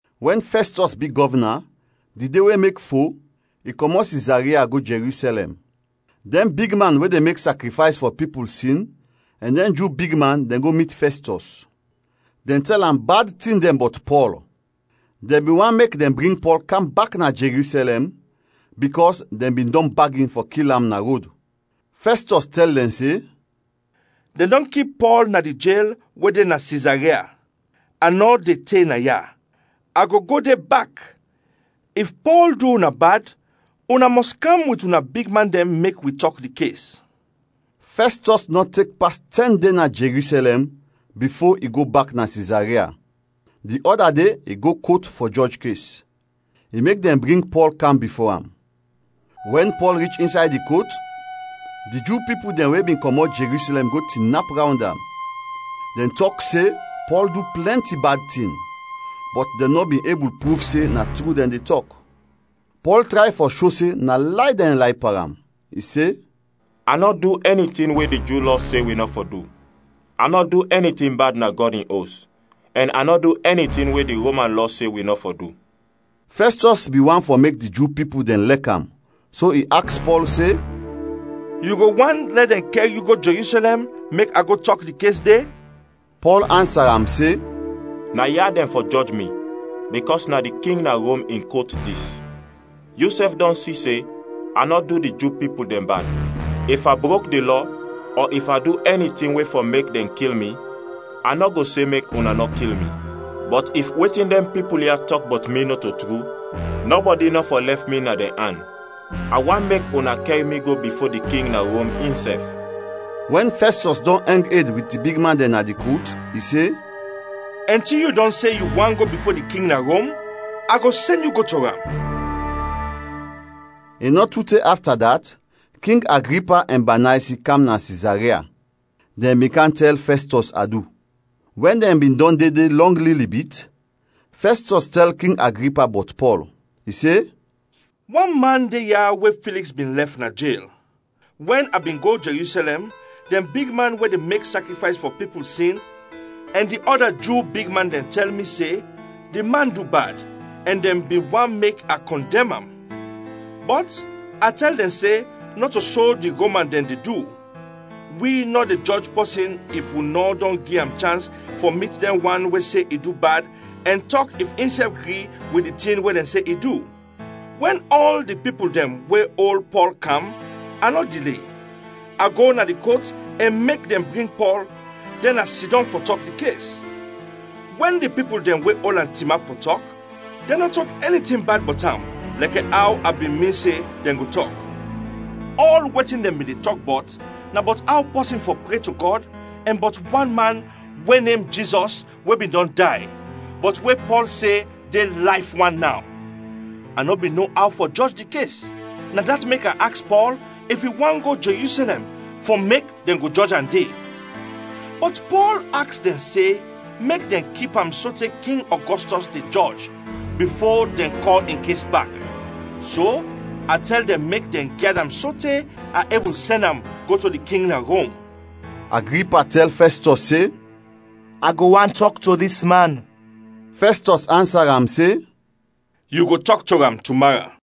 Wɛn Fɛstɔs bi gɔvna, di de we mek fo, i kɔmɔt Sizaria go Jerusɛlɛm. Dɛn bigman we de mek sakrifays fɔ pipul sin ɛn dɛn Ju bigman dɛn go mit Fɛstɔs. Dɛn tɛl am bad tin dɛn bɔt Pɔl. Dɛn bin want mek dɛn bring Pɔl kam bak na Jerusɛlɛm, bikɔs dɛn bin dɔn bagin fɔ kil am na rod. Fɛstɔs tɛl dɛn se, “Dɛn dɔn kip Pɔl na di jel we de na Sizaria. A nɔ de te naya, a go go de bak. If Pɔl du una bad, una mɔs kam wit una bigman dɛn mek wi tɔk di kes.” Fɛstɔs nɔ tek pas tɛn de na Jerusɛlɛm bifo i go bak na Sizaria. Di ɔda de i go kot fɔ jɔj kes; i mek dɛn bring Pɔl kam bifo am. Wɛn Pɔl rich insay di kot, di Ju pipul dɛn we bin kɔmɔt Jerusɛlɛm go tinap rawnd am. Dɛn tɔk se Pɔl du plɛnti bad tin, bɔt dɛn nɔ bin ebul pruv se na tru dɛn de tɔk. Pɔl tray fɔ sho se na lay dɛn lay pan am, i se, “A nɔ du ɛni tin we di Ju Lɔ se wi nɔ fɔ du, a nɔ du ɛni tin bad na Gɔd in Os, ɛn a nɔ du ɛni tin we di Roman lɔ se wi nɔ fɔ du.” Fɛstɔs bin want fɔ mek di Ju pipul dɛn lɛk am so i aks Pɔl se, “Yu go want lɛ dɛn kɛr yu go Jerusɛlɛm, mek a go tɔk di kes de?” Pɔl ansa am se, “Naya dɛn fɔ jɔj mi bikɔs na di king na Rom in kot dis. Yusɛf dɔn si se a nɔ du di Ju pipul dɛn bad. If a brok di lɔ ɔ if a du ɛni tin we fɔ mek dɛn kil mi, a nɔ go se mek una nɔ kil mi. Bɔt if wetin dɛn pipul ya tɔk bɔt mi nɔto tru, nɔbɔdi nɔ fɔ lɛf mi na dɛn an. A want mek una kɛr mi go bifo di king na Rom insɛf.” Wɛn Fɛstɔs dɔn ɛng ed wit di bigman dɛn na di kot, i se, “Ɛnti yu dɔn se yu want go bifo di king na Rom, a go sɛn yu go to am.” I nɔ tu te afta dat, King Agripa ɛn Banaysi kam na Sizaria. Dɛn bin kam tɛl Fɛstɔs adu. Wɛn dɛn bin dɔn de de lɔng lili bit, Fɛstɔs tɛl King Agripa bɔt Pɔl; i se, “Wan man de ya we Filiks bin lɛf na jel. Wɛn a bin go Jerusɛlɛm, dɛn bigman we de mek sakrifays fɔ pipul sin ɛn di ɔda Ju bigman dɛn tɛl mi se di man du bad, ɛn dɛn bin want mek a kɔndɛm am. Bɔt a tɛl dɛn se nɔto so di Roman dɛn de du; wi nɔ de jɔj pɔsin if wi nɔ dɔn gi am chans fɔ mit dɛn wan we se i du bad ɛn tɔk if insɛf gri wit di tin we dɛn se i du. Wɛn ɔl di pipul dɛn we ol Pɔl kam, a nɔ dile; a go na di kot ɛn mek dɛn bring Pɔl, dɛn a sidɔm fɔ tɔk di kes. Wɛn di pipul dɛn we ol am tinap fɔ tɔk, dɛn nɔ tɔk ɛni tin bad bɔt am lɛkɛ aw a bin min se dɛn go tɔk. Ɔl wetin dɛn bin de tɔk bɔt na bɔt aw pɔsin fɔ pre to Gɔd ɛn bɔt wan man we nem Jizɔs we bin dɔn day, bɔt we Pɔl se de layf wan naw. A nɔ bin no aw fɔ jɔj di kes; na dat mek a aks Pɔl if i want go Jerusɛlɛm fɔ mek dɛn go jɔj am de. Bɔt Pɔl aks dɛn se mek dɛn kip am sote King Ɔgɔstɔs de jɔj, bifo dɛn kɔl in kes bak. So a tɛl dɛn mek dɛn gyad am sote a ebul sɛn am go to di king na Rom.” Agripa tɛl Fɛstɔs se, “A go want tɔk to dis man.” Fɛstɔs ansa am se, “Yu go tɔk to am tumara.”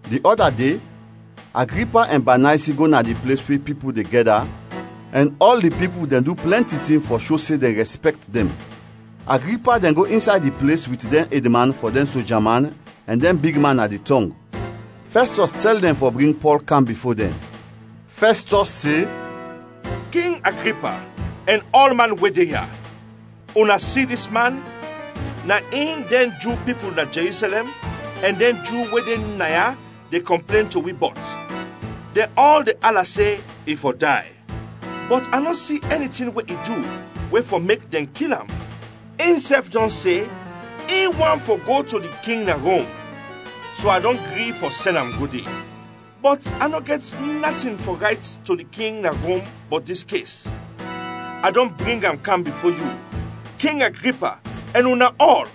Di ɔda de, Agripa ɛn Banaysi go na di ples we pipul de gɛda ɛn ɔl di pipul dɛn du plɛnti tin fɔ sho se dɛn rɛspɛkt dɛn. Agripa dɛn go insay di ples wit dɛn edman fɔ dɛn soja man ɛn dɛn bigman na di tɔng. Fɛstɔs tɛl dɛn fɔ bring Pɔl kam bifo dɛn. Fɛstɔs se, “King Agripa ɛn ɔlman we de ya; una si dis man, na in dɛn Ju pipul na Jerusɛlɛm ɛn dɛn Ju we de naya de kɔmplen to wi bɔt. Dɛn ɔl de ala se i fɔ day. Bɔt a nɔ si ɛni tin we i du we fɔ mek dɛn kil am. Insɛf dɔn se in want fɔ go to di king na Rom, so a dɔn gri fɔ sɛn am go de. Bɔt a nɔ gɛt natin fɔ rayt to di king na Rom bɔt dis kes. A dɔn bring am kam bifo yu, king Agripa ɛn una ɔl,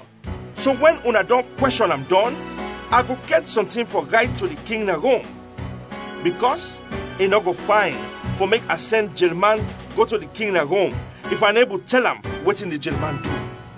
so wɛn una dɔn kwɛshɔn am dɔn, a go gɛt sɔntin fɔ rayt to di king na Rom. Bikɔs i nɔ go fayn fɔ mek a sɛn jelman go to di king na Rom if a nɔ ebul tɛl am wetin di jelman du.”